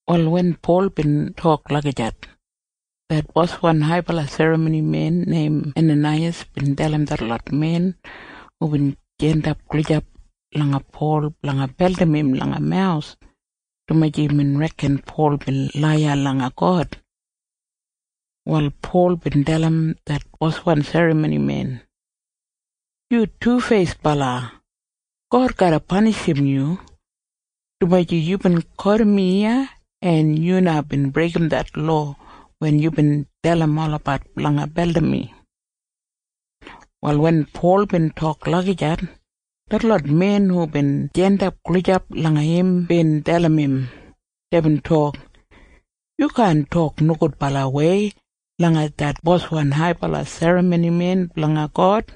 Wal wen Pol bin tok lagijat, det boswan haibala serramonimen neim Enanaiyas bin dalim detlot men hubin jandap gulijap langa Pol blanga beldim im langa mawus, dumaji imbin reken Pol bin laiya langa God. Wal Pol bin dalim det boswan serramonimen, “Yu tufeisbala! God garra panishim yu, dumaji yubin kotim mi iya, en yu na bin breigim det lowa wen yubin dalim olabat blanga beldim mi.” Wal wen Pol bin tok lagijat, detlot men hubin jandap gulijap langa im bin dalim im. Deibin tok, “Yu kaan tok nogudbalawei langa det boswan haibala serramonimen blanga God.”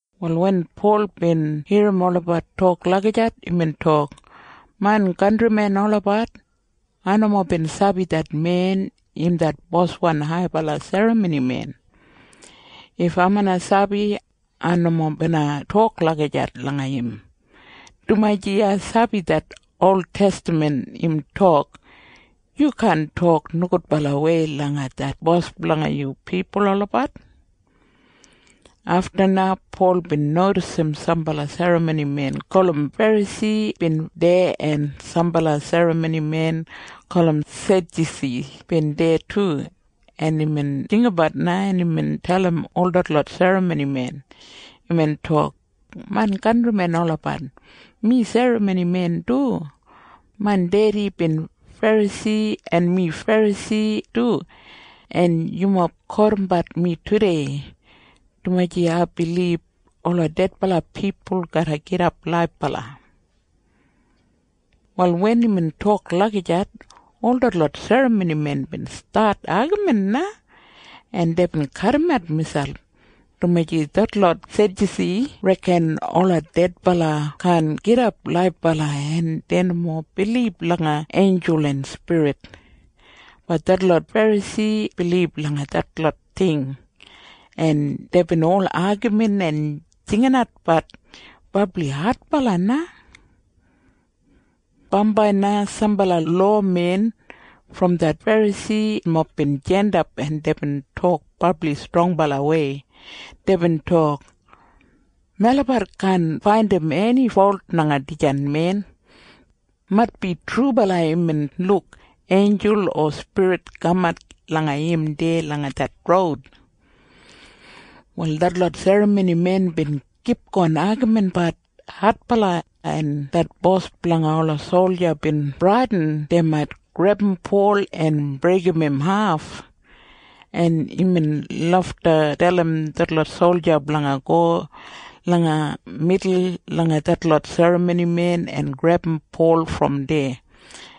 Wal wen Pol bin irrim olabat tok lagijat, imbin tok, “Main kantrimen olabat, ai nomo bin sabi det men im det boswan haibala serramonimen. If ai bina sabi, ai nomo bina tok lagijat langa im, dumaji ai sabi det oltestaman im tok, ‘Yu kaan tok nogudbalawei langa det bos blanga yu pipul olabat.’” Afta na Pol bin nodisim sambala serramonimen gulum Ferasi bin deya en sambala serramonimen gulum Sedyusi bin deya du. En imbin jinggabat na, en imbin dalim ol detlot serramonimen. Imbin tok, “Main kantrimen olabat, mi serramonimen du. Main dedi bin Ferasi, en mi Ferasi du, en yumob kotimbat mi tudei, dumaji ai bilib ola dedbala pipul garra gidap laibala.” Wal wen imbin tok lagijat, ol detlot serramonimen bin stat agamin na, en deibin kadimat miselp, dumaji detlot Sedyusi reken ola dedbala kaan gidap laibala en dei nomo bilib langa einjul en spirit. Bat detlot Ferasi bilib langa detlot ting. En deibin ol agamin en jinginatbat brabli adbala na. Bambai na sambala lowamen brom det Ferasimob bin jandap, en deibin tok brabli strongbalawei. Deibin tok, “Melabat kaan faindim eni folt langa dijan men. Maitbi trubala imbin luk einjul o spirit kamat langa im deya langa det roud.” Wal detlot serramonimen bin kipgon agaminbat adbala, en det bos blanga ola solja bin bradin dei mait grebum Pol en breigim im haf, en imbin lafta dalim detlot solja blanga go langa midul langa detlot serramonimen en grebum Pol brom deya,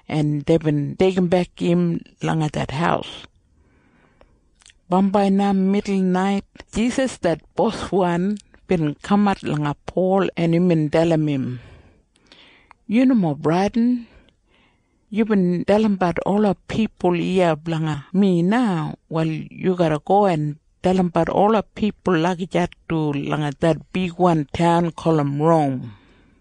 en deibin deigimbek im langa det haus. Bambai na midulnait Jisas det Boswan bin kamat langa Pol, en imbin dalim im, “Yu nomo bradin. Yubin dalimbat ola pipul iya blanga mi na. Wal yu garra go en dalimbat ola pipul lagijat du langa det bigwan taun gulum Rom.”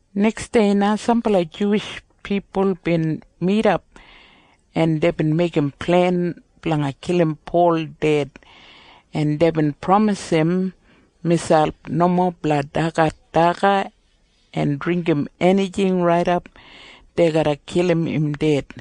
Neksdei na sambala Juwish pipul bin midap, en deibin meigim plen blanga kilim Pol ded, en deibin pramisim miselp nomo blanga dagat daga en dringgim enijing raidap dei garra kilim im ded.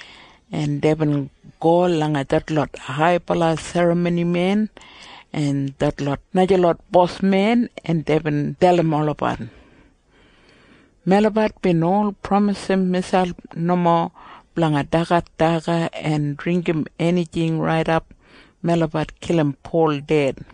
en deibin go langa detlot haibala serramonimen en detlot najalot bosmen, en deibin dalim olabat, “Melabat bin ol pramisim miselp nomo blanga dagat daga en dringgim enijing raidap melabat kilim Pol ded.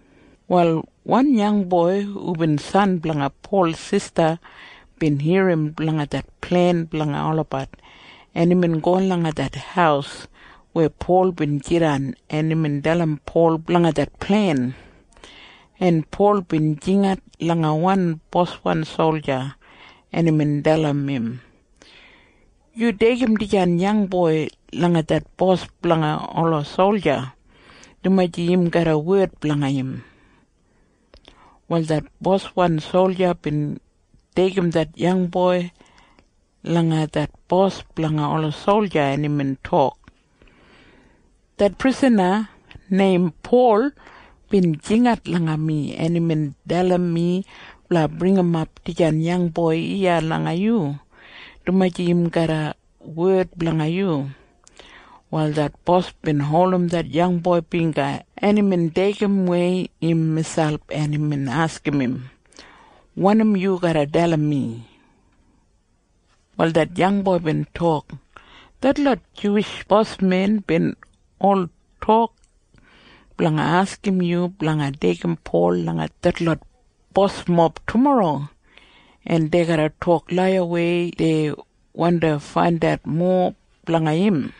Wal wan yangboi hubin san blanga Pol sista bin irrim blanga det plen blanga olabat, en imbin go langa det haus weya Pol bin jidan, en imbin dalim Pol blanga det plen, en Pol bin jingat langa wan boswan solja, en imbin dalim im, “Yu deigim dijan yangboi langa det bos blanga ola solja, dumaji im garram wed blanga im.” Wal det boswan solja bin deigim det yangboi langa det bos blanga ola solja, en imbin tok, “Det prisana neim Pol bin jingat langa mi, en imbin dalim mi blanga bringimap dijan yangboi iya langa yu, dumaji im garram wed blanga yu.” Wal det bos bin holdim det yangboi bingga, en imbin deigimwei im miselp, en imbin askim im, “Wanim yu garra dalim mi?” Wal det yangboi bin tok, “Detlot Juwish bosmen bin ol tok blanga askim yu blanga deigim Pol langa detlot bosmob tumorro, en dei garra tok laiyawei dei wandi faindat mowa blanga im.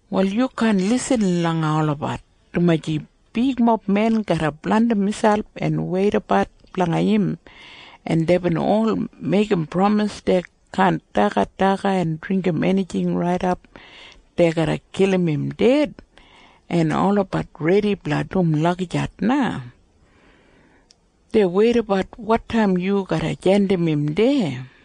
Wal yu kaan lisin langa olabat, dumaji bigmob men garra blandim miselp en weidabat blanga im, en deibin ol meigim pramis dei kaan dagat daga en dringgim enijing raidap dei garra kilim im ded, en olabat redi blanga dum lagijat na. Dei weidabat wotaim yu garram jandim im deya.”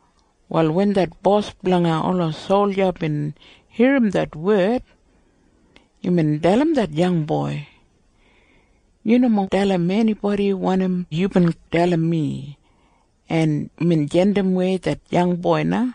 Wal wen det bos blanga ola solja bin irrim det wed, imbin dalim det yangboi, “Yu nomo dalim enibodi wanim yubin dalim mi.” En imbin jandimwei det yangboi na.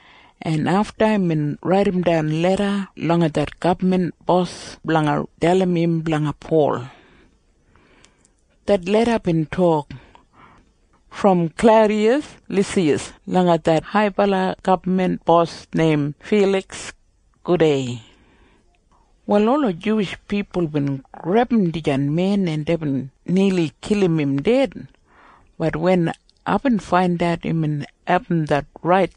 en afta imbin raidimdan leda langa det gabman bos blanga dalim im blanga Pol. Det leda bin tok, “Brom Klaudiyas Lisiyas langa det haibala gabman bos neim Filiks. Gudei. Wal ola Juwish pipul bin grebum dijan men, en deibin nili kilim im ded. Bat wen aibin faindat imbin abum det rait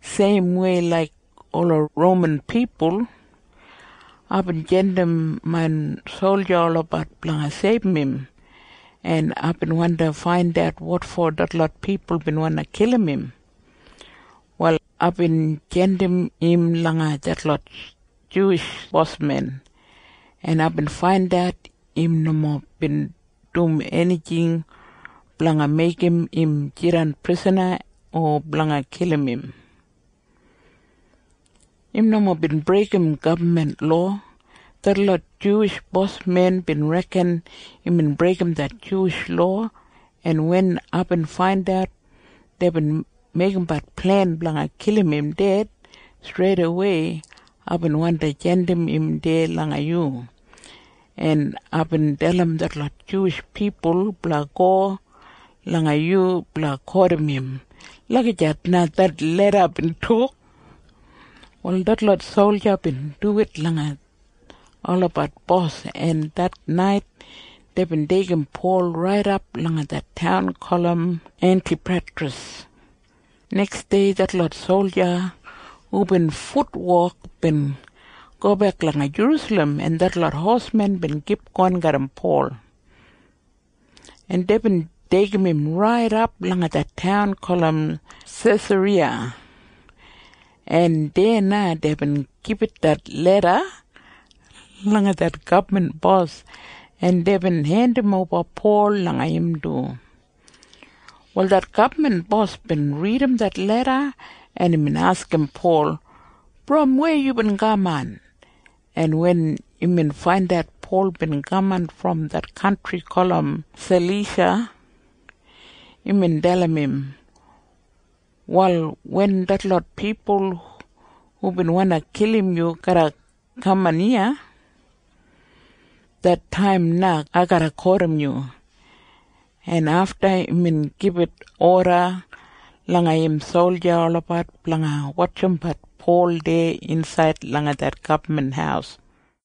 seimwei laik ola Roman pipul, aibin jandim main solja olabat blanga seibum im, en aibin wandi faindat wotfo detlot pipul bin wandi kilim im. Wal aibin jandim im langa detlot Juwish bosmen, en aibin faindat im nomo bin dum enijing blanga meigim im jidan prisana o blanga kilim im. Im nomo bin breigim gabman lowa. Detlot Juwish bosmen bin reken imbin breigim det Juwish lowa, en wen aibin faindat deibin meigimbat plen blanga kilim im ded, streidawei aibin wandi jandim im deya langa yu, en aibin dalim detlot Juwish pipul blanga go langa yu blanga kotim im.” Lagijat na det leda bin tok. Wal detlot solja bin duwit langa olabat bos, en det nait deibin deigim Pol raidap langa det taun gulum Entipatras. Neksdei detlot solja hubin futwok bin gobek langa Jerusalem, en detlot hosmen bin kipgon garram Pol, en deibin deigim im raidap langa det taun gulum Sesariya, en deya na deibin gibit det leda langa det gabman bos, en deibin hendimoba Pol langa im du. Wal det gabman bos bin ridim det leda, en imbin askim Pol, “Brom weya yubin kaman?” En wen imbin faindat Pol bin kaman brom det kantri gulum Salisha, imbin dalim im, “Wal wen detlot pipul hubin wandi kilim yu garra kaman iya, det taim na ai garra kotim yu.” En afta imbin gibit oda langa im solja olabat blanga wotjimbat Pol deya insaid langa det gabman haus.